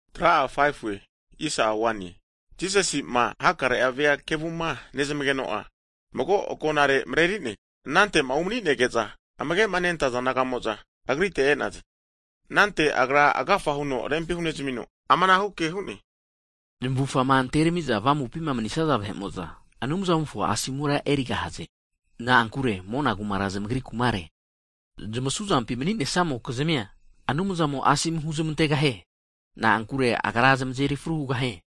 Hagi Jisasi'ma hakare vea kevuma nezmageno'a, mago agonare mareri'ne. Anante'ma umanige'za, amage'ma nentaza disaipoli naga'mo'za Agrite e'naze. Anante Agra agafa huno rempi hunezamino, amanage hu'ne, Zamufama anterami'za avamupima manisaza vahe'mo'za, Anumzamofo asomura erigahaze. Na'ankure mona kumara zamagri kumare. Zamasu zampi mani'ne'samokizmia, Anumzamo'a asomu huzmantegahie. Na'ankure Agra zamazeri fru hugahie.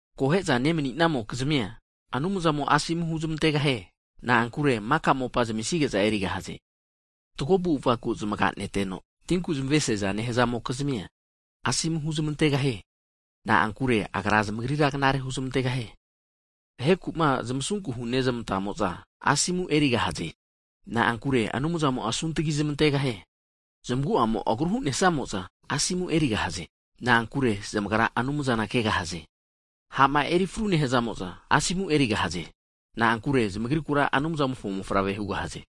Akohe'za nemanimokizmia Anumzamo'a asomu huzmantegahie. Na'ankure maka mopa zamisige'za erigahaze. Fatgo avu'avaku zamaganeteno, tinku zamesiaza nehazamokizmia Anumzamo'a asomu huzmantegahie. Na'ankure Agra zamagrira knare huzmantegahie. Vaheku'ma zamasunku hunezmantamokizmia Anumzamo'a asunku huzmantegahie. Na'ankure Anumzamo'a asuntgi zamantegahie. Zamagu'amo'ma agru hu'nesamo'za, Asomu erigahaze. Na'ankure zamagra Anumzana kegahaze. Ha'ma erifru nehazamo'za, asomu erigahaze. Na'ankure zamagrikura Anumzamofo mofavre hugahaze.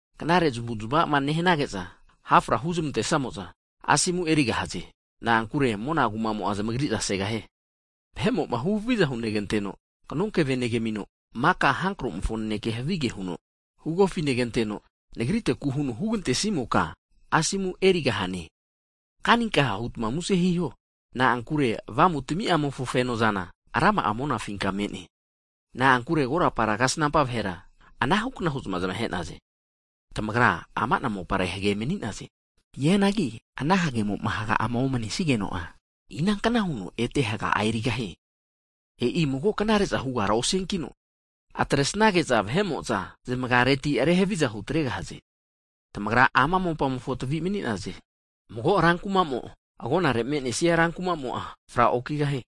Knare zamavuzmama nehanage'za hafra huzmantesamo'za, asomura erigahaze. Na'ankure mona kumamo'a zamagri'za segahie. Vahe'mo'ma huhaviza huneramanteno, kanonkeve neramino, maka hankromofo nanekea havige huno hugofi neramanteno, Nagriteku huno havigema huramantesimota, asomu erigahagahaze. Kaninkaha hutma muse hiho, na'ankure avamutami'mofo fenozana rama'a monafinka me'ne. Na'ankure korapara kasnampa vahera anahukna hu'za zamahe'naze. Tamagra ama'na mopare hage mani'naze. Hianagi ana hagemo'ma haga'ama omanesigeno'a, inanknahu huno hage'a ete erigahie? E'i mago knare'za hugara osiankino, atresnage'za vahe'mo'za zamagareti rehaviza hutregahaze. Tamagra ama mopamofo tavi mani'naze. Mago rankumamo agonare me'nesia rankumamo'a fra okigahie.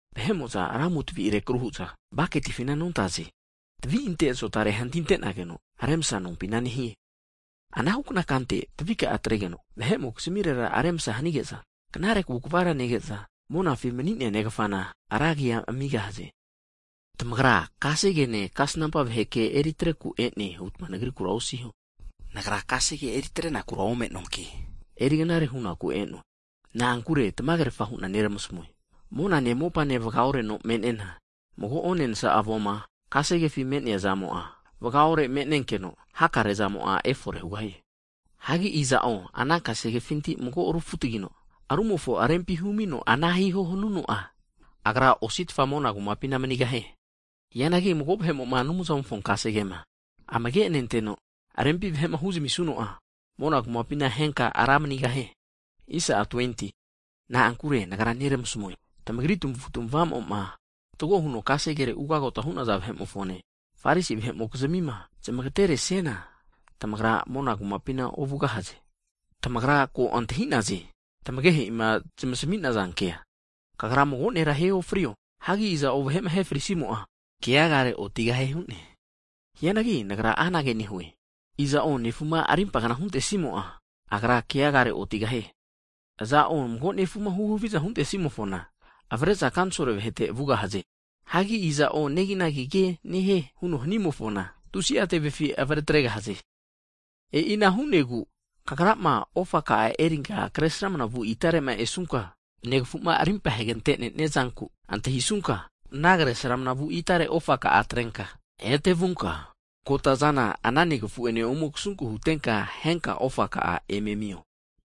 Vahe'mo'za ramu tavi rekru hu'za baketifina nontaze. Tavi ante azotare hantintenageno remasa nompina nehie. Anahu kante tavika'a atregeno, vahe'mokizmirera remsa hanige'za, knare kavu kvara nege'za, monafi mani'nea Negafana ra agi amigahaze. Tamagra kasegene, kasnampa vahe ke eri atreku e'ne hutma Nagrikura osiho. Nagra kasegene kasnampa ke eri atrenaku ome'noanki, eri knare hunaku e'noe. Nagra tamagerafa hu'na neramasmue, monane mopane vaga'oreno me'nena, mago onensa avoma kasegefi me'nea zamo'a vagaore me'nenkeno, hakare zamo'a efore hugahie. Hagi iza'o ana kasegefinti mago rufutagino, rumofo rempi humino, ana hiho hanuno'a, agra ositfa mona kumapina manigahie. Hianagi mago vahe'mo'ma Anumzamofo kasegema amage nenteno, rempi vahe huzmisuno'a, mona kumapina henka ra agine vahe manigahie. Na'ankure Nagra neramasmue, tamagri tamavu'tamavamo'ma fatgo huno kasegere ugagota hu'naza vahe'mofone, Farisi vahe'mokizmima, zamagatema oresiana, tamagra mona kumapina ovugahaze. Tamagra ko antahi'naze, tamagehe'ima zamasmi'naza kea, Kagra mago vahera ahe ofrio, hagi iza'o vahe'ma ahe frisimo'a, keagare otigahie hu'ne. Hianagi Nagra anage nehue, iza'o nefuma rimpa kna huntesimo'a, agra keagare otigahie. Aza'o mago nefuma huhaviza hunte'simofona, avare'za kanisolo kva vahete (Sanhedrin) vugahaze. Hagi iza'o neginagi ke nehie huno hanimofona, tusi'a tevefi avare tregahaze. E'ina hu'negu, kagrama ofa ka'a erinka kre sramanavu itare'ma esunka, negafu'ma rimpa hegante nenia zanku antahisunka, ana kresramana vu itare ofa ka'a atrenka ete vunka, kotazana ana negafu'ene ome kasunke hutenka, henka ofaka'a eme amio.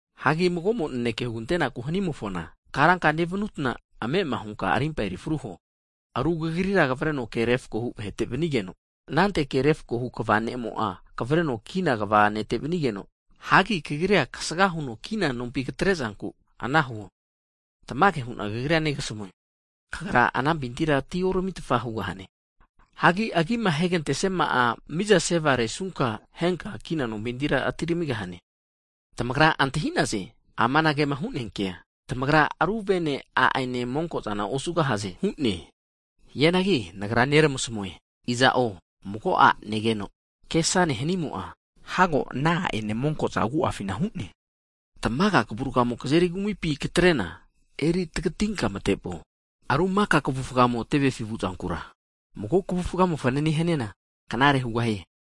Hagi mago'mo naneke hugantenaku hanimofona karanka nevutna ame'ama hunka rimpa eri fru huo, aru kagrira kavreno ke refakohu vahete vanigeno, anante ke refakohu ne'mo'a kavreno kina kva ne'te vanigeno, hagi kagrira kasaga huno kina nompi katre'zanku, ana huo. Tamage hu'na kagrira negasamue, kagra anampintira atioramitfa hugahane, hagi agima ahegantesiama'a mizase varesunka henka kina nompintira atiramigahane. Tamagra antahi'naze amanagema hu'nea kea, Tamagra ru vene, a'ene monko'zana osugahaze hu'ne. Hianagi Nagra neramasmue, aza'o mago a' negeno kesane hanimo'a, hago ana a'ene monko'za agu'afina hu'ne. Tamaga kavurgamo kazeri kumipi katre'na, eri tagitinka mate vuo, na'ankure ru maka kavufa tevefi (hell) vu'zankura, mago kvufamo fanane hani'ana, knare hugahie.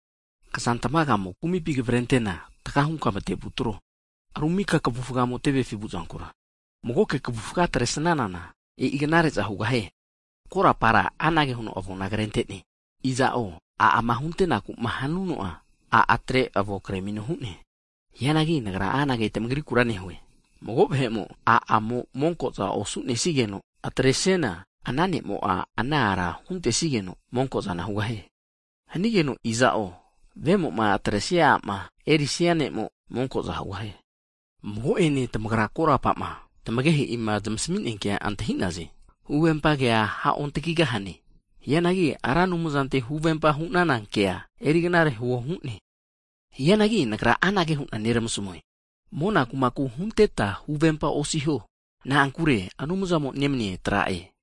Kazantmaga'amo kumipi kavrentena, taga hunka matevu atro. Ru mika kavufamo tevefi vu'zankura mago kavufa atresanana, e'i knare'za hugahie. Korapara anage huno avona krente'ne, Iza'o a' ama huntenaku hanuno'a, a' atre avonkre amino hu'ne. Ana hanigeno Nagra anage tamagrikura nehue, mago vahe'mo a' a'mo monko'za osu'nenigeno atre'siana, ana ne'mo'a ana ara huntesigeno monko'zana hugahie. Hanigeno iza'o, vemo'ma atre'nesia a'ma erisia ne'mo'a, monko'za hugahie. Mago'ene tamagra korapama, tamagehe'ima zamasmi'nea kea antahi'naze, Huvempa kea ha'ontagigahane. Hianagi Ra Anumzantera huvempa hu'nana kea eri knare huo hu'ne. Hianagi Nagra anage hu'na neramasmue, mona kumaku hunteta huvempa osiho, na'ankure Anumzamo nemania tra'e,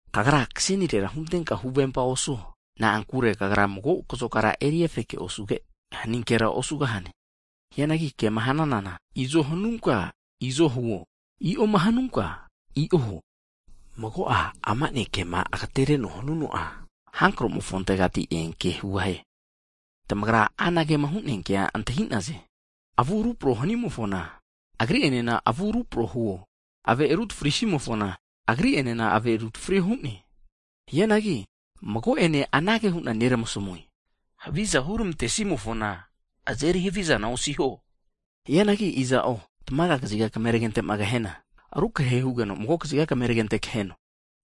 Kagra kasenire huntenka huvempa osuo, na'ankure kagra mago kazokara eri efeke osuge, haninkera osugahane. Hianagi kema hananana, izo hanunka, izo huo, i'oma hnunka i'o huo, mago'a amana kema agatereno hanuno'a, hankro'mofontegati eanke hugahie. Tamagra anagema hu'nea kea antahi'naze, Avu rupro hanimofona, agri enena avu rupro huo. Ave rutafri simofona, agri enena ave rutafrio hu'ne. Hianagi mago'ene anage hu'na neramasmue, haviza huramante simofona, azeri havizana osiho. Hianagi iza'o tamaga kaziga kameragente'ma kahena, rukrehe hugeno, mago kaziga kameragente kaheno.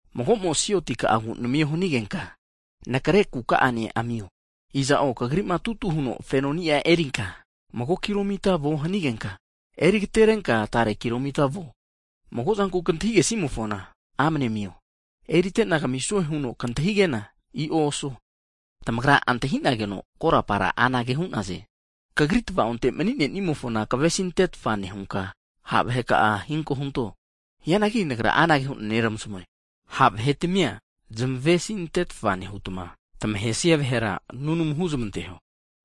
Mago'mo'ma sioti ka'agu namio hanigenka, anakre kuka'ane amio. Iza'o kagri'ma tutu huno fenoni'a erinka, mago kilo mita vuo hanigenka, eriagaterenka tare kilo mita vuo. Mago zanku kantahige simofona amne amio, erite'na kamisue huno kantahigena, i'o osuo. Tamagra antahi'nageno korapara anage hu'naze, Kagri tava'onte mani'nemofona kavesintetfa nehunka, ha' vahe ka'a krimpa hento hu'ne. Hianagi Nagra anage hu'na neramasmue, ha' vahetmia zamesizmantetfa nehuta, tamahesia vahera nunamu huzmanteho.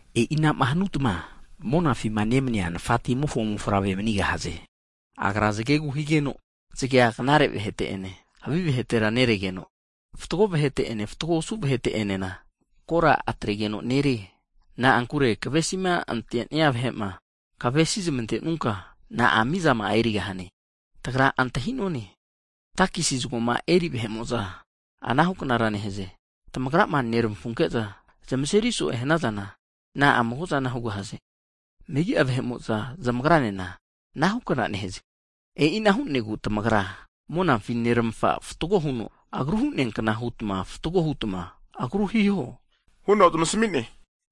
E'inama hanuta monafi nemania Nafatamimofo mofavre manigahaze. Agra zagegu higeno, zagea knare vahete ene, havi vahetera neregeno, fatgo vahete'ene, fatgo osu vahete enena kora atregeno nerie. Na'ankure tamavesima antenia vahe'ma, tamavesi zamantenuta na'a mizama'a erigahaze? Tagra antahi'none, takesi zagoma eri vahe'mo'za anahu knara nehaze. Tamagrama nermafunke'za zamazeri so'e hanazana, na'a mago'a zana hugahaze? Megi'a vahe'mo'za zamagranena anahu kna nehaze. E'ina hu'negu tamagra monafi neramafa'ma fatgo huno agru hu'nea kna hutma fatgo hutma agru hiho huno zamasmi'ne.